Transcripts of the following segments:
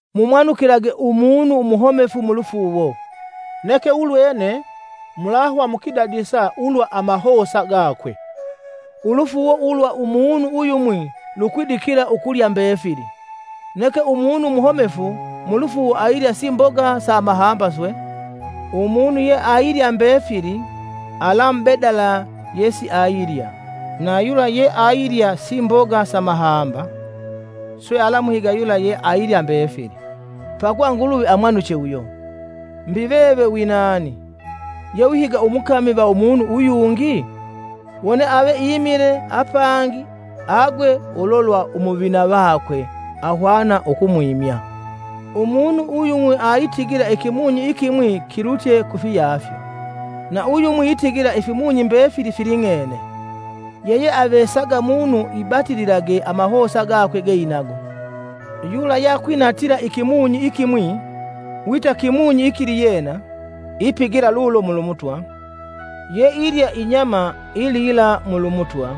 Mumwanukilage umunu umuhomefu mulufuuwo, neke ulwene mulahwa mukwidadisa ulwa amahosa gakwe. Ulufuuwo ulwa umunu uyumwi lukwidikila ukulya mbefili, neke umunu umuhomefu mulufuuwo ailya simboga sa amahamba swe. Umunu yeailya mbefili alamubedala yesiailya; na yula yeailya simboga sa mahamba swe alamuhiga yula yeailye mbefili, pakuva Nguluvi amwanuche uyo. Mbi veve winani, yewihiga umukami va umunu uyungi? Wone ave imile apangi agwe ulo lwa umuvina vakwe; ahwana ukumwimya. Umunu uyumwi aitigila ikimunyi ikimwi kilutye kufiyafyo, na uyumwi itigila ifimunyi mbefili filing'ene. Yeyeavesaga munu ibatililage amahosa gakwe geinago. Yula yeakwinatila ikimunyi ikimwi wita kimunyi ikiliyena, ipigila lulo mulu Mutwa, yeilya inyama ilila mulu Mutwa,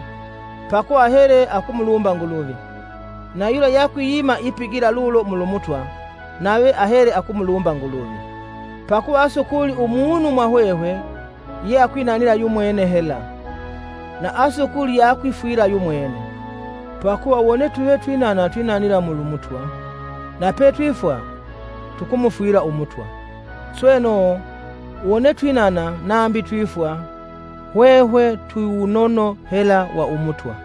pakuva ahele akumulumba Nguluvi; na yula yakwiyima ipigila lulo mulu Mutwa nave ahele akumulumba Nguluvi. Pakuva asukuli umunu mwa hwehwe yeakwinanila yumwene hela, na asukuli yeayikwifwila yumwene, Pakuva wone tuve twinana twinanila mulu Mutwa, na petwifwa, tukumufwila Umutwa. Sweno, wone twinana nambi twifwa, hwehwe twi wunono hela wa Umutwa.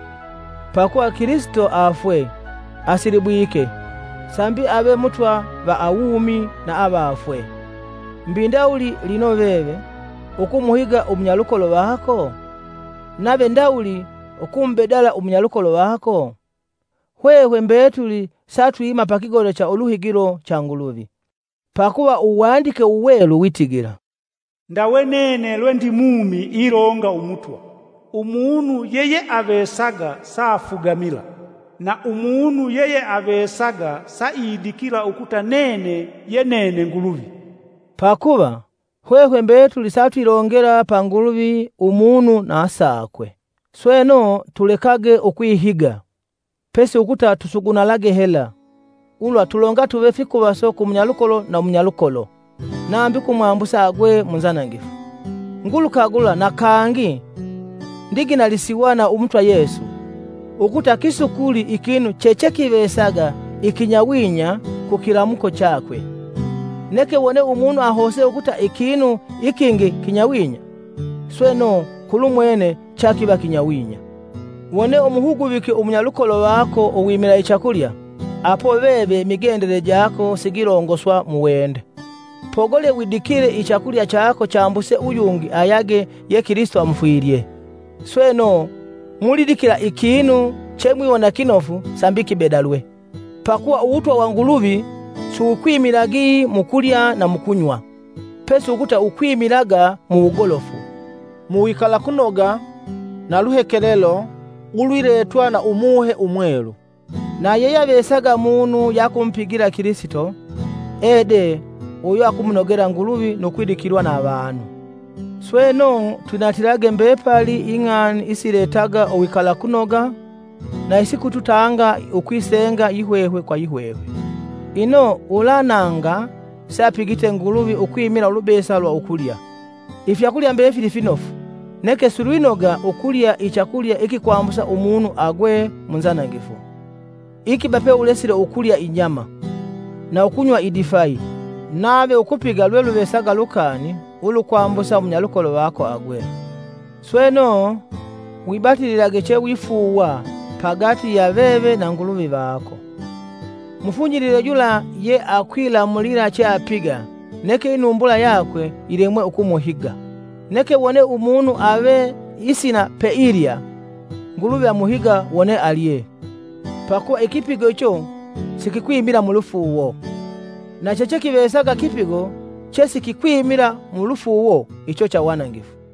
Pakuva Kilisito afwe, asilibwike, sambi ave Mutwa va awumi na avafwe. Mbi ndawuli lino veve, ukumuhiga umunyalukolo vako? Nave ndawuli ukumubedala umunyalukolo vako? Hwehwe mbetuli satwima pa kigoda cha uluhigilo cha Nguluvi. Pakuva Uwandike Uwelu witigila: “Ndawe nene lwe ndi mumi ilonga Umutwa, umunu yeyeavesaga saafugamila. Na umunu yeyeavesaga saidikila ukuta nene ye nene Nguluvi.” Pakuva, hwehwe mbetuli satwilongela pa Nguluvi umunu na sakwe. Sweno, tulekage ukwihiga, pesi ukuta sugunalage hela, ulwa tulongatuve fikuvaso ku munyalukolo na munyalukolo nambi ukumwambusa agwe mu nzanangifu. Ngulukagula na kangi ndiginalisiwa na Umutwa Yesu, ukuta kisukuli ikinu chechekivesaga ikinyawinya ku kilamuko chakwe; neke wone umunu ahose ukuta ikinu ikingi kinyawinya, sweno, kulumwene chakiva kinyawinya. Wone umuhuguvike umunyalukolo vako uwimila ichakulya, apo veve imigendele jako sigilongoswa mu wende. Pogole widikile ichakulya chako chambuse uyungi ayage ye Kilisito amufwilye! Sweno, mulidikila ikinu chemwiwona kinofu sambi kibedalwe. Pakuva Uwutwa wa Nguluvi si wukwimilagi mu kulya na mu kunywa, pesi ukuta wukwimilaga mu wugolofu, muwikalakunoga na luhekelelo ulwiletwa na Umuhe Umwelu. Na yeyeavesaga munu yeakumupigila Kilisito ede uyo akumunogela Nguluvi nu kwidikilwa na avanu. Sweno, twinatilage mbepali ing'ani isiletaga uwikalakunoga na isikututanga ukwisenga yihwehwe kwa yihwehwe. Ino ulananga seapigite Nguluvi ukwimila ulubesa lwa ukulya. Ifyakulya mbefili finofu, neke silwinoga ukulya ichakulya ikikwambusa umunu agwe mu nzanangifu. Ikiba peulesile ukulya inyama, na ukunywa idifayi nave ukupiga lweluvesaga lukani ulukwambusa umunyalukolo vako agwe. Sweno, wibatililage chewifuuwa pagati ya veve na Nguluvi vako. Mufunyilile yula ye akwilamulila cheapiga neke inumbula yakwe yilemwe ukumuhiga. Neke wone umunu ave isina peilya, Nguluvi amuhiga wone alye, pakuva ikipigo icho sikikwimila mulufuuwo. Na chechekivesaga kipigo chesikikwimila mu lufuuwo icho cha wanangifu.